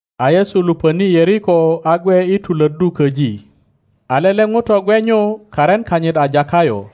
A Yesu luponi Yeriko a gwe i tulöddu köji. A lele ŋuto gwe nyu, karin kanyit a Takayo;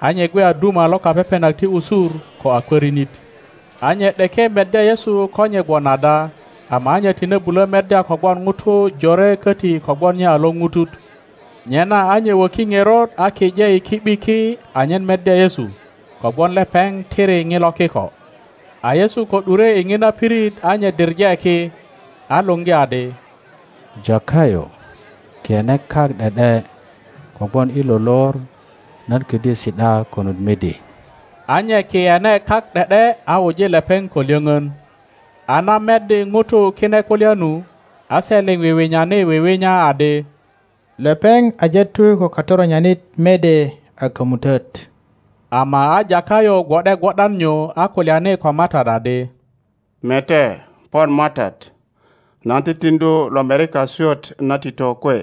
a nye gwe a duma lo kapepenak ti usur, ko a kwörinit. A nye ’deke meddya Yesu ko nye gwon ada, ama a nye tine bulö meddya kogwon ŋutu jore köti kogwon nye a lorutut. Nyena a nye woki ŋerot a kije i ki ’bi ki anyen meddya Yesu, kogwon lepeŋ tiri ŋilo kiko. A Yesu ko ’dure i ŋina pirit a nye diŋe ki, a luŋgi adi, Takayo, kiyene kak ’de ’de; kogwon i lo lor nan ködyö si ’da konut midi. A nye kiyene kak ’de ’de a wuji lepeŋ ko lyöŋön. A na meddi ŋutu kine kulya nu, a se liŋ wiwinyani wiwinya adi, Lepeŋ aje tu ko katoronyanit mede a kömutöt! Ama a Takayo gwo ’de gwo ’dan nyu a kulyani Ko MATAT adi, Mete, pon MATAT, nan titiŋdu lomerika swöt na tito kwe,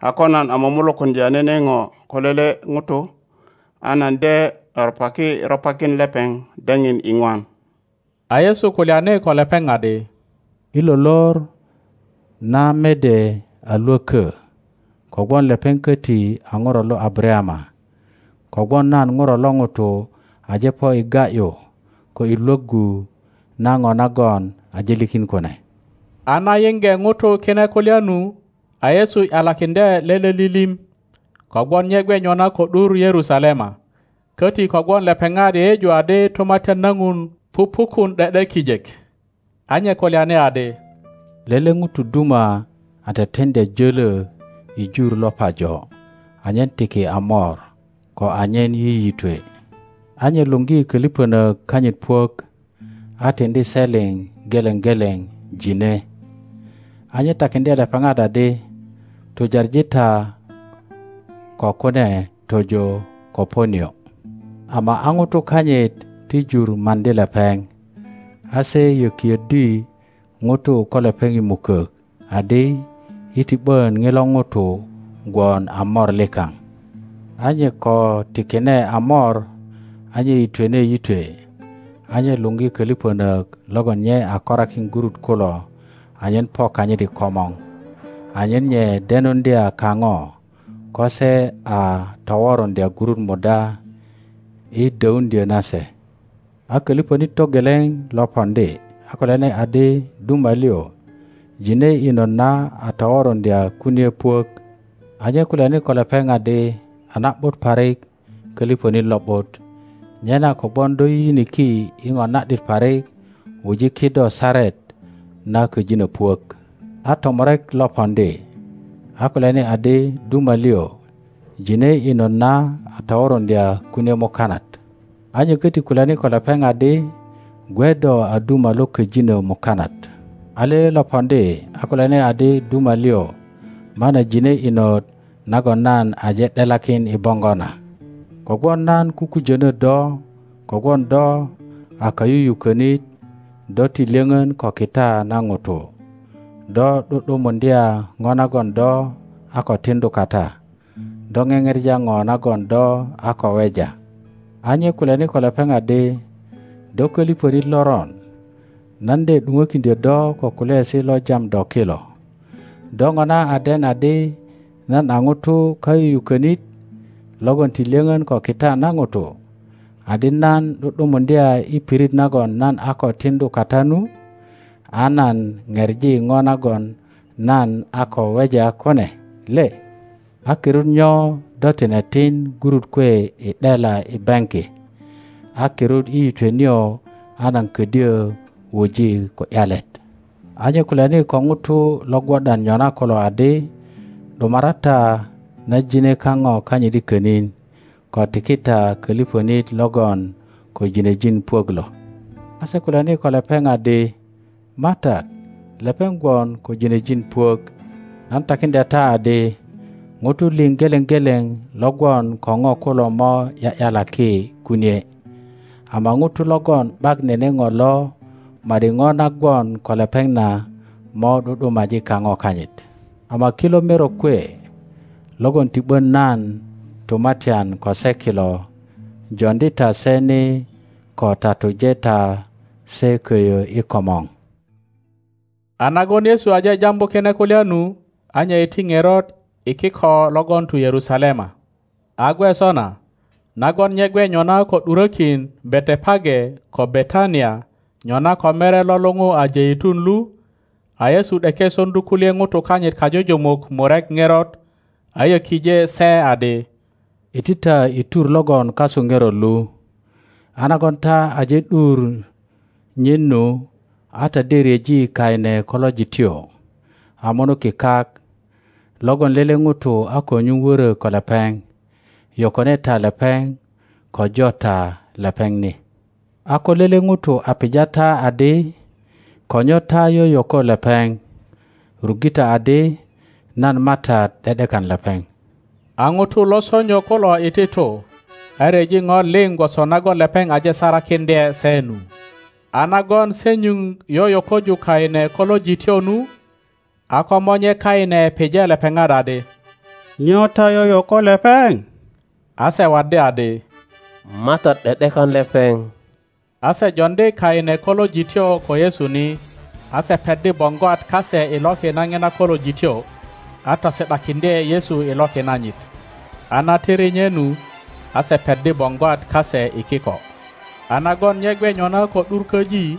a ko nan a mumulukuŋdya nene ŋo ko lele ŋuto, a nan de ropaki ropakin lepeŋ daŋin iŋwan. A Yesu kulyani ko lepeŋ adi, I lo lor na mede a lwökö, kogwon lepeŋ köti a ŋuro lo Abarayama. Kogwon nan Ŋuro lo ŋuto aje po i ga ’yu ko i Iwoggu na ŋo nagon aje likin kune. A na yiŋge ŋutu kine kulya nu, a Yesu ’yalakiŋdye lele lilim, kogwon nye gwe nyona ko ’dur Yerusalema, köti kogwon lepeŋat yeyeju adi Tumatyan na Ŋuti pupukun ’de ’de kijek. A nye kulyani adi, Lele ŋuto duma a teteŋdya jölö i jur lo pajo, anyen tiki a mor, ko anyen yiyitwe. A nye luŋgi köliŋönök kanyit puök, a tiŋdi se liŋ geleŋ geleŋ ŋine. A nye takiŋdye lepeŋat adi, Tujaŋi ta ko kune tojo ko po nio. Ama a ŋutu kanyit ti jur maŋdi lepeŋ; a se yokiöddi ŋutu ko lepeŋ i mukök, adi, Yi ti ’bön ŋilo ŋuto gwon a mor likaŋ. A nye ko tikine a mor, a nye yitwene yitwe. A nye luŋgi köliŋönök logon nye a korakin gurut kulo anyen po kanyit i komor, anyen nye denuŋdya kaŋo ko se a toworuŋdya gurut muda i döuŋdyo nase. A köliŋönit togeleŋ lo poŋdi, a kulyani adi, Duma liŋ, ŋine inot na a toworuŋdya kunie puök. A nye kulyani ko lepeŋ adi, A na ’but parik, köliŋönit lo ’but! Nyena, kogwon do yiyiniki i ŋo na ’dit parik, wuji kido saret na köjinö puök. A tomurek lo poŋdi, a kulyani adi, Duma liŋ, ŋine inot na a toworuŋdya kunie mukanat. A nye köti kulyani ko lepeŋ adi, Gwe do a duma lo köjinö mukanat. a lele lo poŋdi, a kulyani adi, Duma liŋ, mana ŋine inot nagon nan aje ’delakin i boŋgo na; kogwon nan kukujönö do, kogwon do a kayuyukönit do ti lyöŋön ko kita na ŋuto; do ’du ’dumuŋdya ŋo nagon do a ko tiŋdu kata, do ŋeŋepa ŋo nagon do a ko weja. a nye kulyani ko lepeŋ adi, Do köliŋönit loron, nan de ’duŋökiŋdyö do ko kulyaesi lo jam do kilo. Do ŋona a den adi nan a ŋuto kayuyukönit logon ti lyöŋön ko kita na ŋuto, adi nan ’du ’dumuŋdya i pirit nagon nan a ko tiŋdu kata nu, a nan pepi ŋo nagon nan a ko weja kune le? A kirut nyo do tine tin gurut kwe i ’dela i baŋki? A kirut i yitwe nio a nan ködyö wuji ko ’yalet? A nye kulyani ko ŋutu lo gwo ’dan nyona kulo adi, ’Dumara ta na ŋine kaŋo kanyit i könin, ko tiki ta koliŋonit logon ko ginejin puök lo. a se kulyani ko lepeŋ adi, MATAT, lepeŋ gwon ko ginejin puök. Nan takiŋdya ta adi, Ŋutu liŋ geleŋ geleŋ lo gwon ko ŋo kulo mo ’ya ’yalaki kunie, ama ŋuto logon ’bak nene ŋo lo, ma ’di ŋo na gwon ko lepeŋ na mo ’du ’dumaji kaŋo kanyit. Ama kilo merok kwe logon ti ’bön nan tumatyan ko se kilo, joŋdi ta se ni ko tatuje ta se koyo i komor. A nagon Yesu aje jambu kine kulya nu, a nye iti ŋerot i kiko logon tu Yerusalema. a gwe sona, nagon nye gwe nyona ko ’durökin Betepage ko Betania nyona ko mere lo luŋu a Jeitun lu, a Yesu ’deke soŋdu kulye ŋutu kanyit kajujumuk murek ŋerot, a yokije se adi, Iti ta i tur logon kasu ŋerot lu, a nagon ta aje ’dur nyin nu, a ta de ryeji kaine kolojityo a munuki kak, logon lele ŋuto a ko nyuŋ wörö ko lepeŋ; yokone ta lepeŋ ko jo ta lepeŋ ni. A ko lele ŋuto a pija ta adi, Ko nyo ta yoyoko lepeŋ? ruŋge ta adi, nan MATAT ’de ’dekan lepeŋ. a ŋutu lo sonyo kulo iti tu, a ryeji ŋo liŋ gwoso nagon lepeŋ aje sarakiŋdye se nu. a nagon se nyuŋ yoyokoju kaine kolojityo nu, a komonye kaine pije lepeŋat adi, Nyo ta yoyoko lepeŋ? a se waddi adi, MATAT ’de ’dekan lepeŋ. A se joŋdi kaine kolojityo ko Yesu ni, a se peddi boŋgwat kase i loki na ŋina kolojityo, a tosi ’dakiŋdye Yesu i loki nanyit. a na tiri nye nu, a se peddi boŋgwat kase i kiko. a nagon nye gwe nyona ko ’dur köji,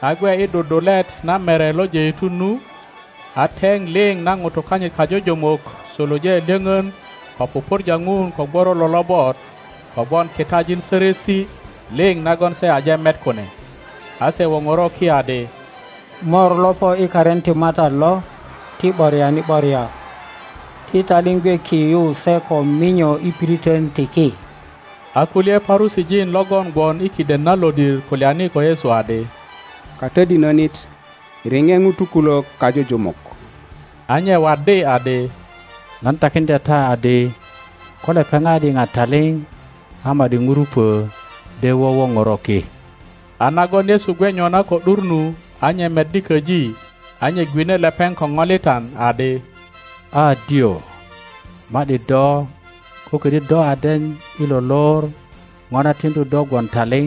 a gwe i dudulet na Mere lo Jeitun nu, a teŋ liŋ na ŋutu kanyit kajujumuk suluje lyoŋon ko pupurja Ŋun ko gworolo lobot kogwon kitajin sörösi liŋ nagon se aje met kune. A se woŋoro ki adi, Mor lo po i karin ti MATAT lo, ti ’boriani ’boria! Ti taliŋ gwe ki yu se ko minyo i piriton ti ki. A kulye Parusijin logon gwon i kiden na lodir kulyani ko Yesu adi, Katodinönit, riŋe ŋutu kulök kajujumuk. A nye waddi adi, Nan takiŋdya ta adi, ko lepeŋat yiŋa taliŋ a ma ’di ŋurupo de wowoŋoro ki! A nagon Yesu gwe nyona ko ’dur nu, a nye meddi köji a nye gwine lepeŋ ko ŋolitan, adi, A dyoŋ, ma ’di do, ko ködyö do a den i lo lor ŋo na tiŋdu do gwon taliŋ!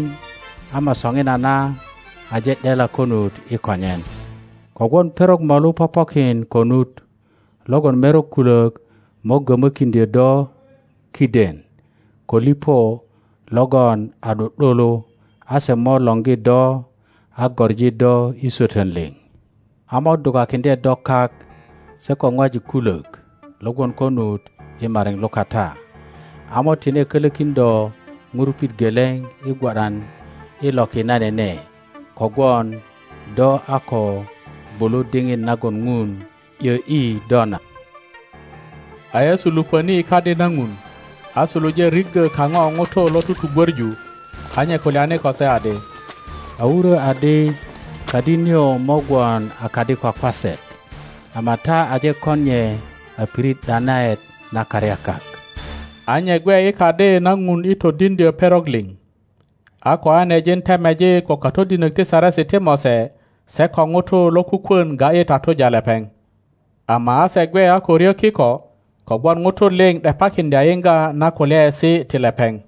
Ama soŋinana aje ’dela konut i konyen. Kogwon perok molu popokin konut logon merok kulök mo gömökiŋdyo do kiden ko liŋo logon a ’du ’dulu, a se mo lorgi do a goŋi do i swötön liŋ; a mo dukakiŋdye do kak se ko ŋwajik kulok lo gwon konut i mariŋ lukata, a mo tine kölokin do ŋurupit geleŋ i gwo ’dan i loki na nene, kogwon do a ko gwulu diŋit nagon Ŋun ’yö ’yi do na. A Yesu lupöni i Kadi na Ŋuri, a suluje riggö kaŋo ŋutu lo tugwöŋu, a nye kulyani ko se adi, A wurö adi, Kadi nio mo gwon a kadi kwakwaset, ama ta aje kon nye a pirit ’danaet na karyakak. a nye gwe i Kadi na Ŋun i todiŋdyö perok liŋ. A koanejin temejik ko katodinök ti Saresi ti Mose se ko ŋutu lokukwön ga ’yi tatuja lepeŋ; ama a se gwe a ko ryö kiko, kogwon ŋutu liŋ ’depakiŋdya i yiŋga na kulyaesi ti lepeŋ.